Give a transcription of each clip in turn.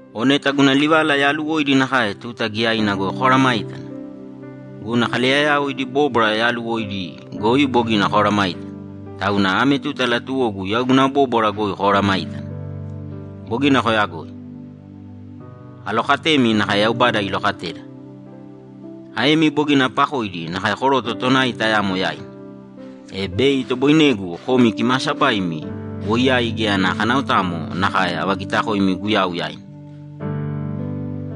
O neta guna livala yaaluwoidi nakae tuta giyaina goi komesayágana! Guna kaleyayao idi bóbwara yaaluwoidi goi bogina komesayágana, tauna ame tuta latuwogu yau guna bóbwara goi komesayágana. Bogina koyagoi. Alokatemi nakae Yaubada ilokateda. Aemi bogina apakoidi nakae koroto tonai tayamo yaina, e bei itoboinegu komi kimaasabaimi woiyai geya ana kanaotamo nakae avagitakoimi Guyau yaina.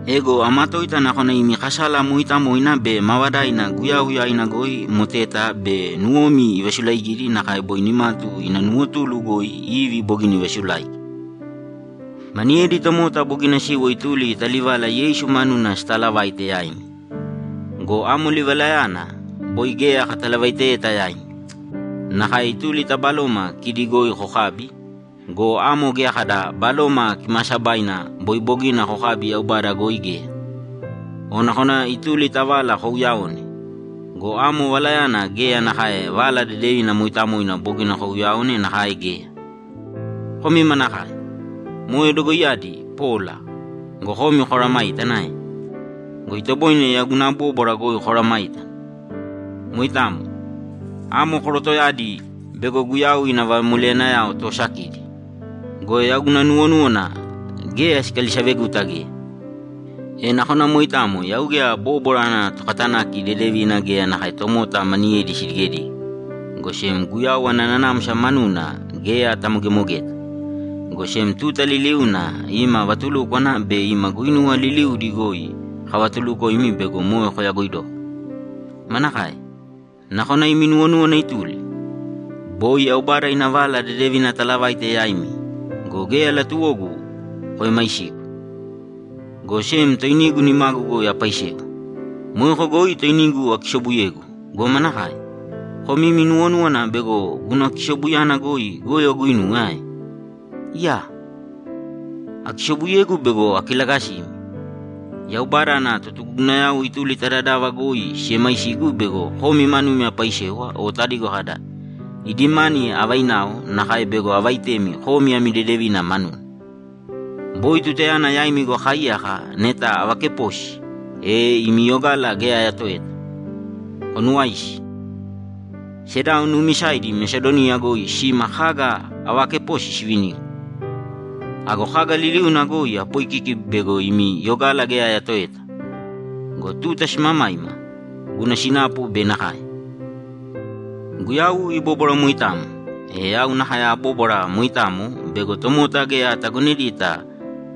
Ego amatoita nakona imi kasala mooitamoina be maavadaina Guyau yaina goi moteta bei nuwomi ivasulaigidi nakae boi nimatu ina nuwotulu goi Ivi bogina ivasulaigi. Maniyedi tomota bogina siwo ituli ta livala Yeisu manuna sitaalavaite yaimi go, amo livalayana boi geya katalavaiteyeta yaimi. Nakae ituli ta baloma kidi goi kokabi go, amo geya kada Baloma Kimaasabaina boi bogina kokabi Yaubada goi geya. O nakona ituli ta vala kouyaone go, amo valayana geya nakae Vala Dedevina mooitamoina bogina kouyaone nakae geya. Komi manakae! Moe dogoiyadi pola go, komi komesayágana ae? Go itoboine yau guna bóbwara goi komesayágana. Moitamo. Amo korotoyadi bego Guyau ina vamoleyanayao toosakidi go, yau guna nuwonúwana geya sikalisaveguta geya. E nakona moitamo yau geya bóbwara ana tokatanaki dedevina geya nakae tomota maniyedi sidigedige, go sem Guyau ana nanamsa manuna geya atamogemogeta, go sem tuta liliuna ima vatulúkwana be ima guinuwa liliudi goi kavatulukoimi bego moe kayagoidoko. Manakae? Nakona imi nuwonúwana ituli? Boi Yaubada ina Vala Dedevina atalavaite yaimi go, geya latuwogu koemaisigu, go sem toinigu nimagu goi apaisewa. Moeko goi toinigu akisobuyegu go, manakae? Komi imi nuwonúwana bego guna kisobuyana goi goyo aguinuwe ae? Iyaa! Akisobuyegu bego akilagasimi! Yaubada ana totugugunayao ituli ta dadava goi siemaisigu bego komi manumi apaisewa o tadigo kada, ‘Idi mani avainao nakae bego avaitemi komi ami dedevina manuna.’ Boi tutayana yaimi goi akaaiyaka neta avakeposi, e imi yogala geya ayatoeta. Konuwaisi. Sedao nuumisaidi Mesadoniya goi sima kaga avaakeposi sivinigu. Ago kaga liliuna goi apoikiki bego imi yogala geya ayatoeta go, tuta simamaima, guna sinapu bei nakae. Guyau ibóbwara moitamo, e yau nakae abóbwara moitamo bego tomota geya atagonedita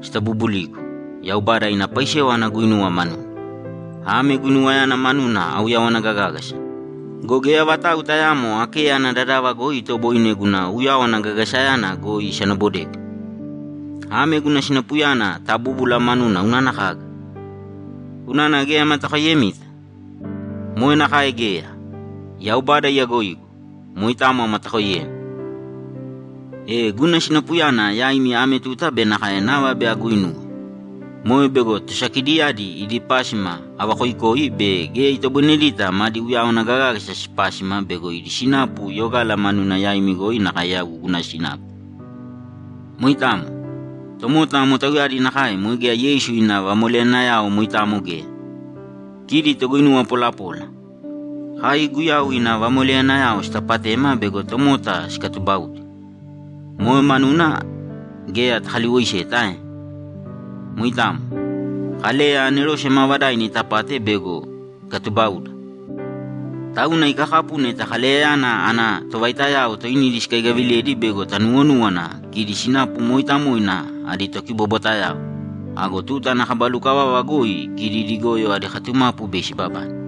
sitabubuligu Yaubada ina paisewa aguuinuwe manuna. Ame guinuwayana manuna auyawana gagágasa go, geya vatau tayaamo Akeya ana dadava goi itoboine guna uyawana gagagasayana goi isanabodegu. Ame guna sinapuyana tabúbula manuna unana kaga? Unana geya amatakoiyemita? Moe nakae geya! Yaubada iyagoidokoigu! Moitamo amatakoiyemi! E guna sinapuyana yaimi ame tuta be nakae nava bei aguuinuwe. Moe bego tosakidiyadi idi pásima avakoikoi bei geya itoboinedita madi uyawana gagágasa sipásima bego idi sinapu yogala manuna yaimi goi nakae yau guna sinapu. Moitamo. Tomota amo tauyadi nakae moe geya Yeisu ina vamoleyanayao moitamo geya. Kidi toguinuwa polapola. Kai Guyau ina vamoleyanayao sitapatema bego tomota sikatubaudi. Moe manuna geya takaliwoiseta ae? Moitamo. Kaleya anerose maavadaina itapate bego ikatubauda. Tauna ikakapu neta Kaleyayana ana tovaitayao toinidi sikaigaviledi bego tanuwonúwana kidi sinapu mooitamoina adi tokibobwatayao. Ago tuta ana kaba lukavava goi kidi idi goyo adi katumapu bei sibabane.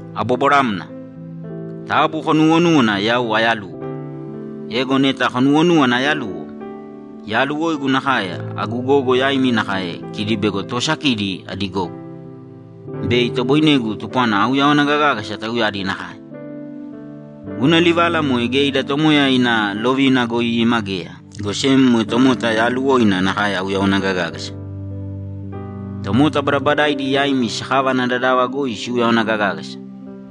Abobwaramna. Taabu konuuwonūwana yau ayaluwo. Ego neta konuwonúwana ayaluwo, yaaluwoigu nakae agu gogo yaimi nakae kidi bego toosakidi adi gogo, bei itoboinegu tupwana auyawana gagágasa tauyadi nakae. Guna livala moe geya ida Tomoya ina lovina goi ima geya, go sem moe tomota yaaluwoina nakae auyawana gagágasa. Tomota badabadaidi yaimi sakava ana dadava goi siuyawana gagágasa,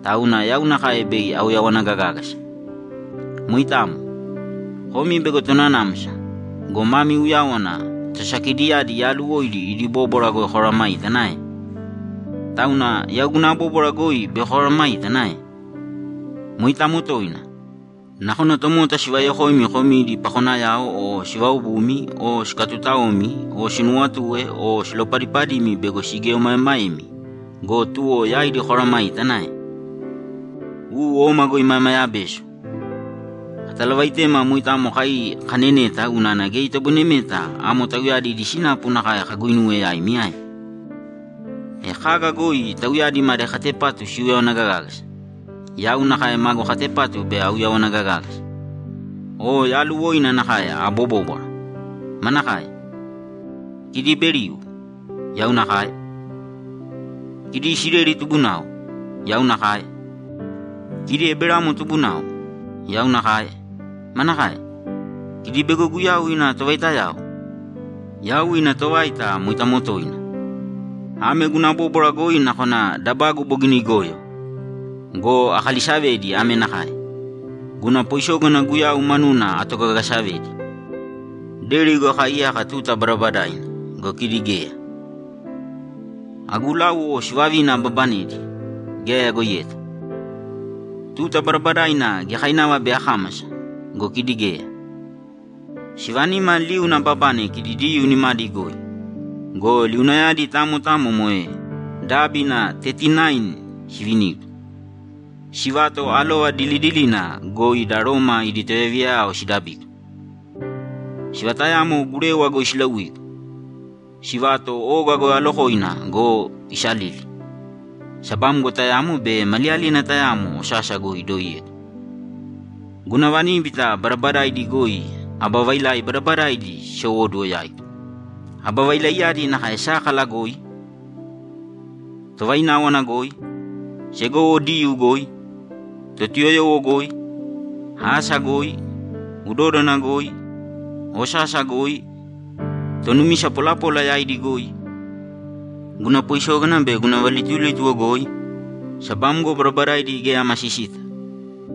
tauna yau nakae bei auyawana gagágasa. Moitamo. Komi bego tonanamsa go, mami uyáwana tosakidiyadi yaaluwoidi idi bóbwara goi komesayágana ae? Tauna yau guna bóbwara goi bei komesayágana ae? Moitamo toina. Nakona tomota sivayokoimi komi idi pakonayao o sivaobumi o sikatutaoimi o sinuwatue o silopadipadimi bego sigieomaemaemi go, tuwo yaidi komesayágana ae? U, oma go imayamaya beso; katalavaitema moitamo kai kaneneta unana geya itoboinemeta amo tauyadi idi sinapu nakae kaguinuwe yaimi ae? E kaga goi tauyadi madi katepatu siuyawana gagágasa, yau nakae magu katepatu bei auyawana gagágasa. O yaaluwoina nakae abobóbwara! Manakae? Kidi Iberiu? Yau nakae. Kidi Isileli tubunao? Yau nakae. Kidi Eberamo tubunao? Yau nakae. Manakae? Kidi bego Guyau ina tovaitayao? Yau ina tovaita moitamo toina. (Ame guna bóbwara goi nakona dabagu bogina igoyo!) Go akalisavedi ame nakae: Guna poisógana Guyau manuna atogagasavedi. Deri goi akaaiyaka tuta badabadaina go, kidi geya. Agu láuwo sivavina ababanedi, geya ayagoiyeta. Tuta badabadaina giyakainava bei akámasa go, kidi geya. Sivanima liuna ababane kidi Diyuu nimadi goi go, liunayadi tamo tamo moe dábina tetinain sivinigu. Sivato alova dilidilina goi da Roma idi tovayaviya sidabigu. Sivatayamo gurewa goi silauigu. Sivato oga goi alokoina go, isalili. Sabamgo tayamo be maliyalina tayamo osasa goi idoiyegu. Guna vaníbita badabadaidi goi aba vailai badabadaidi sisowóduwo yaigu. Aba vailaiyadi nakae sákala goi, tovaináwana goi, segowo Diyuu goi, Totuyoyowo goi, asa goi, udódana goi, osasa goi, tonumisa polapola yaidi goi, guna poisógana be guna valitulítuwo goi, sabamgo badabadaidi geya amasisita,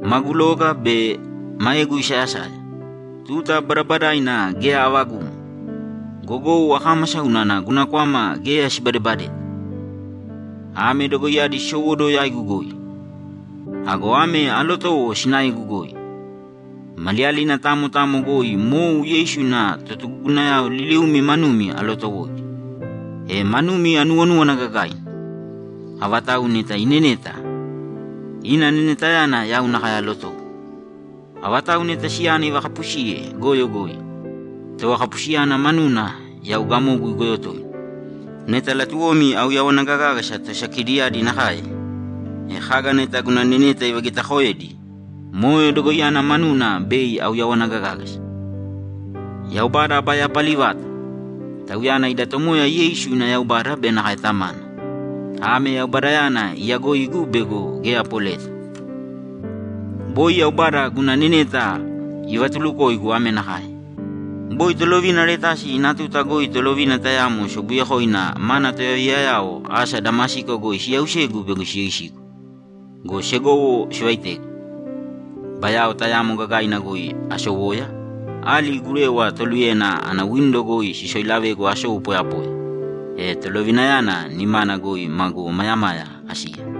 magu loga be maegu isayasaya, tuta badabadaina geya avagumo, gogou akámasa unana guna kwama geya sibadebadeta. Ame dogoiyadi sisowóduwo yaigu goi. Ago ame alotowo sinaegu goi: Maliyalina tamo tamo goi mou Yeisu ana totugugunayao liliumi manumi alootowoidi, e manumi anuwonúwana gagaina. Avatau neta ineneta, ina nenetayana yau nakae alotowo. Avatau neta siyana ivakapusiye goyo goi, tovakapusiyana manuna yau gamogu igoyo toina. Neta latuwomi auyawana gagágasa tosakidiyadi nakae, e kaga neta guna neneta ivagitaakoedi, moe dogoiyana manuna bei auyawana gagágasa. Yaubada aba yapali vata! Tauyana ida Tomoya Yeisu ina Yaubada be nakae Tamana. Ame Yaubadayana iyagoigu bego geya apoleta. Boi Yaubada guna neneta ivatulukoigu ame nakae: Boi tolovina Aretasi ina tuta goi tolovina tayamo sobuyekoina mana tovayaviyayao asa Damasiko goi siyausegu bego siyoisigu go, segowo sivaitegu. Bayao tayamo gagaina goi asowoya, ali gurewa toluyena ana windo goi sisoilavegu asou poyapoya, e tolovinayana nimana goi magu omayamaya asiya.